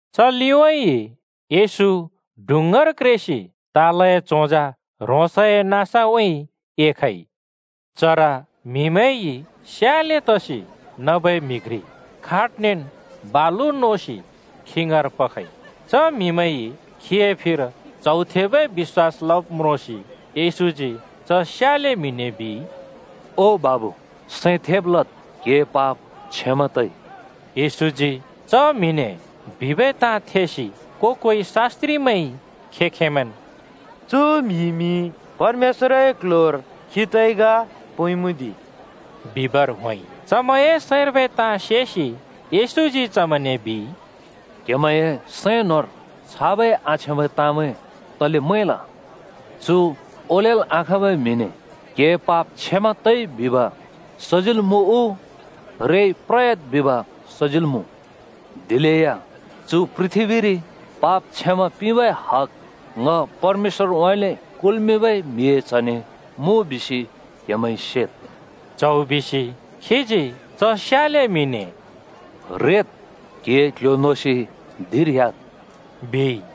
च लिउँइँ येशू डुँङ्गार क्रेसि तालए चोंजा ह्रोंसए नाँसउँइँ एखइ। चर म्हिमैंइ स्याले तसि नबै म्हि घ्रि खाटनेन् बालु नोसि खी ङाँर पखइ। च म्‍हिमैंइ खीए फिर च्हौ थेबै बिश्‍वास लब् म्रोंसि येशूजी च स्याले म्‍हिने बिइ, “ओ बाबु, सैं थेब् लद्। क्‍हिए पाप क्षमा तइ।” येशूजी च म्हिने बिबै ताँ थेसि को-कोइ शास्‍त्रिमैंइ खें-खेंमैंन् “चु म्‍हिइमि परमेश्‍वरए क्ल्ह्‍योर खी तइ ग पोंइमुँ दि!” बिबर होंइ। चमैंए सैंर्बै ताँ सेसि येशूजी चमैंने बिइ, “क्हेमैंए सैं न्होंर छाबै आछ्याँबै ताँमैं तले मैंल? चु ओलेल् आखाँबै म्‍हिने ‘क्हिए पाप क्षमा तइ’ बिब सजिल् मुँ उ ‘रेसि प्रद्’ बिब सजिल् मुँ? दिलेया चु पृथ्‍बीरि पाप क्षमा पिंबै हग ङ परमेश्‍वरउँइँले कुल्‍मिंबै म्हिए च्हने मुँ बिसि क्हेमैंइ सेद्।” च्हौ बिसि खीजी च स्याले म्हिने “रेद्, क्हिए क्‍ल्‍ह्‍यो नोसि धिंर ह्‍याद्,” बिइ।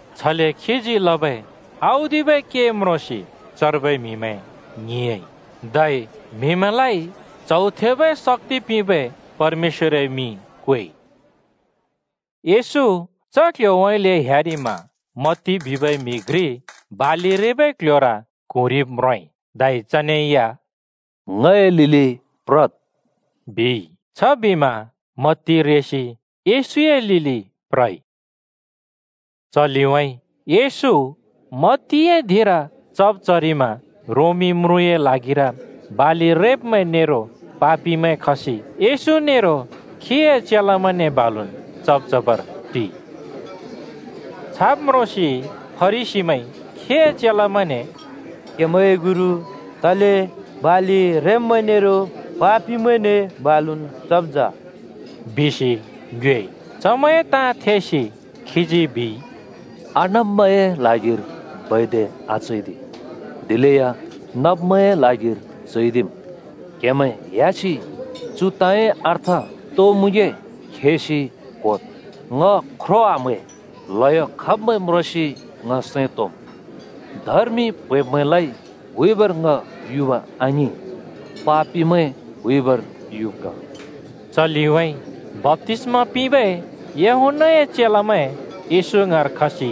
छले खीजी लबै औदिबै के म्रोंसि चर्बै म्हिमैं ङ्हिंयाँइ, धै म्हिमैंलाइ च्हौ थेबै शक्‍ति पिंबै परमेश्‍वरए मिं क्वेइ। येशू च क्‍ल्‍ह्‍योउँइँले ह्‍यारिमा मत्ती बिबै म्‍हि घ्रि बालि रेबै क्ल्ह्‍योर क्हुँरिब म्रोंइ, धै चने या “ङए लिलि प्रद्!” बिइ। छबिमा मत्ती रेसि येशूए लिलि प्रइ। च लिउँइँ येशू मत्तीए धिंर चब् चरिमा रोमी म्रुँए ल्हागिर बालि रेब्‍मैं नेरो पापिमैं खसि येशू नेरो खीए चेलामैंने बालुन् चब् चबर टिइ। छाब् म्रोंसि फरिसीमैंइ खीए चेलामैंने “क्‍हेमैंए गुरु तले बालि रेब्‍मैं नेरो पापिमैंने बालुन् चब् जा?” बिसि ङ्योएइ। चमैंए ताँ थेसि खीजी बिइ, “आनब्मैंए ल्हागिर बैद्द आचैदि, दिलेया नब्मैंए ल्हागिर चैदिम्। क्‍हेमैं ह्‍यासि चु ताँए अर्थ तो मुँगे खेसि क्होद्, ‘ङ ख्रो आम्है, ल्हयो खब्मैं म्रोंसि ङ सैं तोंम्।’ धर्मि प्हैंब्मैंलाइ हुइबर ङ युब् आङिं, पापिमैं हुइबर युब् ग।” च लिउँइँ बप्‍तिस्‍मा पिंबै यूहन्‍नाए चेलामैं येशू ङाँर खसि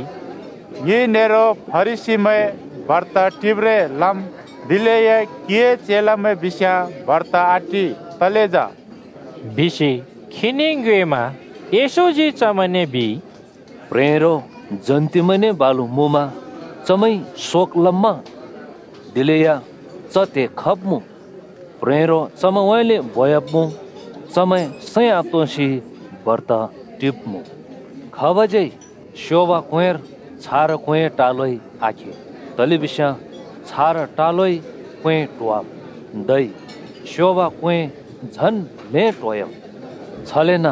“ङि नेरो फरिसीमैं बर्त टिब्रें लम्, दिलेया क्‍हिए चेलामैं बिस्‍याँ बर्त आटि, तले जा?” बिसि खीने ङ्योएमा येशूजी चमैंने बिइ, “प्ह्रेंरो जन्तिमैंने बालु मुँमा चमैंइ शोक लम्‍मा? दिलेया च त्हे खब्मुँ, प्ह्रेंरो चमैंउँइँले बोयाब्मुँ। चमैं सैं आतोंसि बर्त टिब्‍मुँ।” “खाबज्‍यै स्योब क्‍वेंर छारा क्वेंए टालोइ आखे। तलेबिस्याँ छारा टालोइ क्वें ट्होवाम्। धै स्योब क्‍वें झन् ल्हें ट्होह्‍याम्। छलेन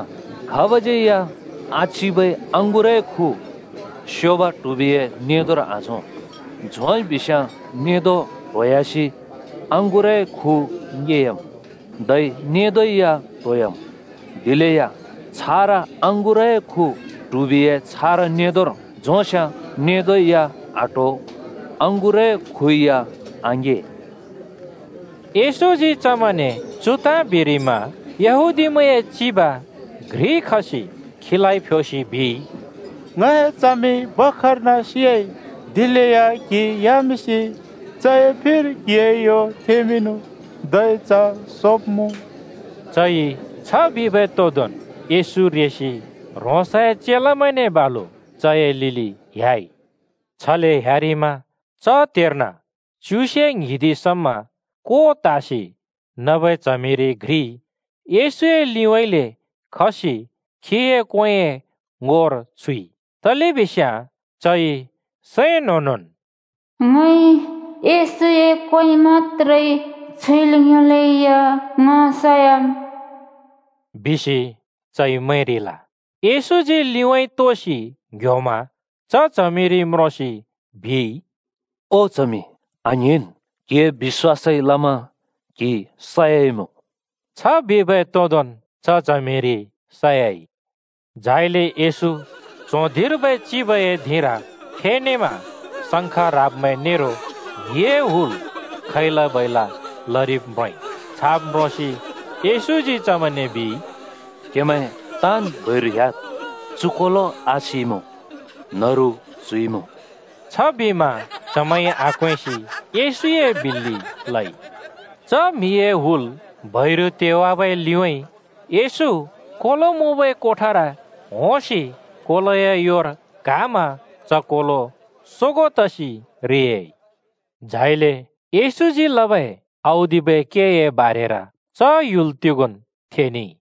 खाबज्यै या आचिबै अँगुरए खु स्योब ट्हुबिए नेंदोर आझों। झोंइ बिस्‍याँ नेंदो ट्होह्‍यासि अँगुरए खु ङे‍याम्, धै नेंदों या ट्होयाम्। दिलेया छारा अँगुरए खु ट्हुबिए छारा नेंदोर झोंस्‍याँ नेंदो या आट्हो अँगुरए खु या आङेया।” येशूजी चमैंने चु ताँ बिरिमा यहूदीमैंए चिब घ्रि खसि खीलाइ फ्योसि बिइ, “ङए च्हमि भर्खर्न सियाइ, दिलेया क्हि ह्‍यामिंसि चए फिर क्हिए यो थेंमिंनु। धै च सोब्‍मुँ।” चइ छ बिबै तोदोंन् येशू रेसि ह्रोंसए चेलामैंने बालु चए लिलि ह्‍याइ। छले ह्‍यारिमा च त्हेर्न च्युसे ङ्हिदि समा को त्हसि नबै च्हमिरि घ्रिइ येशूए लिउँइँले खसि खीए क्‍वेंए ङोर छुइ। तलेबिस्याँ चइ सैं न्‍होंनोंन् “ङइ येशूए क्‍वें मत्‍त्रे छुइल् योंलेया ङ सयाम्,” बिसि चइ मैंरिल। येशूजी लिउँइँ तोसि ङ्‍ह्‍योमा च च्हमिरि म्रोंसि बिइ, “ओ च्हमि, आङ्हिंन्, क्हिए बिश्‍वासइ लमा क्हि सयाइमुँ।” छ बिबै तोंदोंन् च च्हमिरि सयाइ। झाइले येशू च्हों धिंर्बै चिबए धिंर फेनेमा शंङ्ख ह्राब्मैं नेरो म्हिए हुल खैला-बैला लरिब् म्रोंइ। छाब म्रोंसि येशूजी चमैंने बिइ, “क्‍हेमैं ताँन् बैरु ह्‍याद्, चु कोलो आसिइमुँ, न्‍हरु च्‍हुइमुँ।” छबिमा चमैंइ आक्वेंसि येशूए बिल्‍लि लइ। च म्‍हिए हुल बैरु तेवाबै लिउँइँ येशू कोलो मुँबै कोठार होंसि कोलोए योर क्‍हामा च कोलो सोगों तसि रे‍याइ। झाइले येशूजी लबै औदिबै केए बारेर च ह्‍युल तिगोंन् थेनेइ।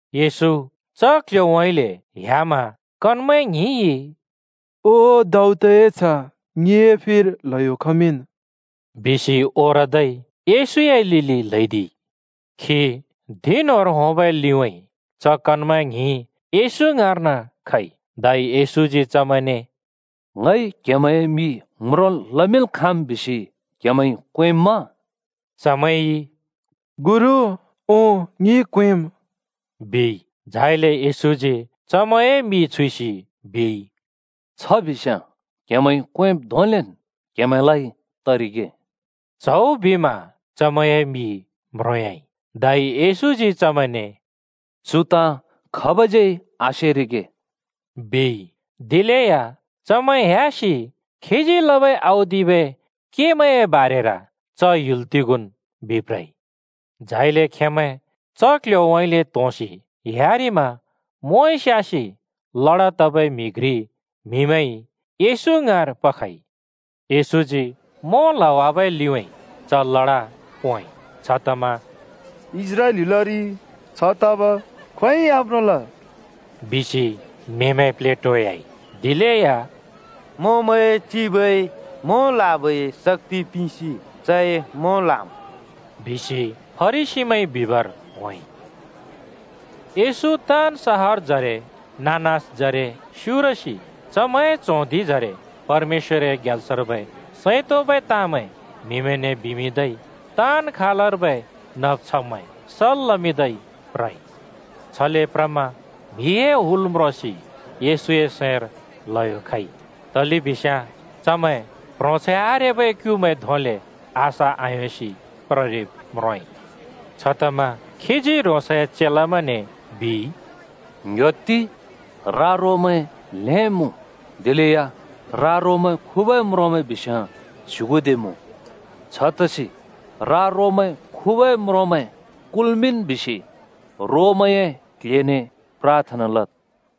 येशू च क्‍ल्‍ह्‍योउँइँले ह्‍यामा कनमैं ङ्हिंइ “ओ दाऊदए च्ह, ङिए फिर ल्हयो खमिंन्,” बिसि ओरदै येशूए लिलि ल्हैदिइ। खी धिं न्‍होंर होंबै लिउँइँ च कनमैं ङ्हिं येशू ङाँर्न खइ। धै येशूजी चमैंने “ङइ क्हेमैंए मि म्रोंल् लमिंल् खाँम् बिसि क्हेमैंइ क्वेंम्मा?” चमैंइ “ओं, गुरु, ङिइ क्वेंम्,” बिइ। झाइले येशूजी चमैंए मि छुइसि बिइ, “छ बिस्‍याँ क्‍हेमैंइ क्वेंब् धोंलेन् क्हेमैंलाइ तरिगे।” च्‍हौ बिमा चमैंए मि म्रोंयाइ। धै येशूजी चमैंने “चु ताँ खाबज्यै आसेरिगे,” बिइ। दिलेया चमैं ह्‍यासि खीजी लबै औदिबै केमैंए बारेर च ह्‍युल तिगोंन् बिप्रइ। झाइले खेंमैं च क्ल्ह्‍योउँइँले त्होंसि ह्‍यारिमा मोंइ स्‍यासि लडा तबै म्‍हि घ्रि म्‍हिमैंइ येशू ङाँर पखइ। येशूजी मों ल्‍हावाबै लिउँइँ च लडा पोंइ। छतमा “इस्राएल ह्‍युलरि छ तब खोंयोंइ आम्रोंल,” बिसि म्‍हिमैं प्लेटोयाइ। दिलेया “मोंमैंए चिबइ मों ल्‍हाबै शक्‍ति पिंसि चइ मों ल्हाम्,” बिसि फरिसीमैंइ बिबर होंइ। येशू ताँन् सहरजरे नाँ-नाँसजरे स्‍युरसि चमैंए च्हों धिंजरे परमेश्‍वरए ग्याल्सर्बै सैं तोंबै ताँमैं म्‍हिमैंने बिमिंदै ताँन् खालर्बै नब् छब्मैं सल् लमिंदै प्रइ। छले प्रमा म्‍हिए हुल म्रोंसि येशूए सैंर ल्‍हयो खइ। तलेबिस्याँ चमैं प्‍ह्रोंछैं आरेबै क्‍युमैं धोंले आशा आयोंसि प्ररिब् म्रोंइ। छतमा खीजी ह्रोंसए चेलामैंने बिइ, “ङ्‌ह्‍योत्ति! रा-रोमैं ल्हेंन् मुँ, दिलेया रा-रोमैं खुबै म्रोंमैं बिस्‍याँ च्‍युगुदे मुँ। छतसि रा-रोमैं खुबै म्रोंमैं कुल्‍मिंन् बिसि रोमैंए क्‍ल्‍हेने प्राथना लद्।”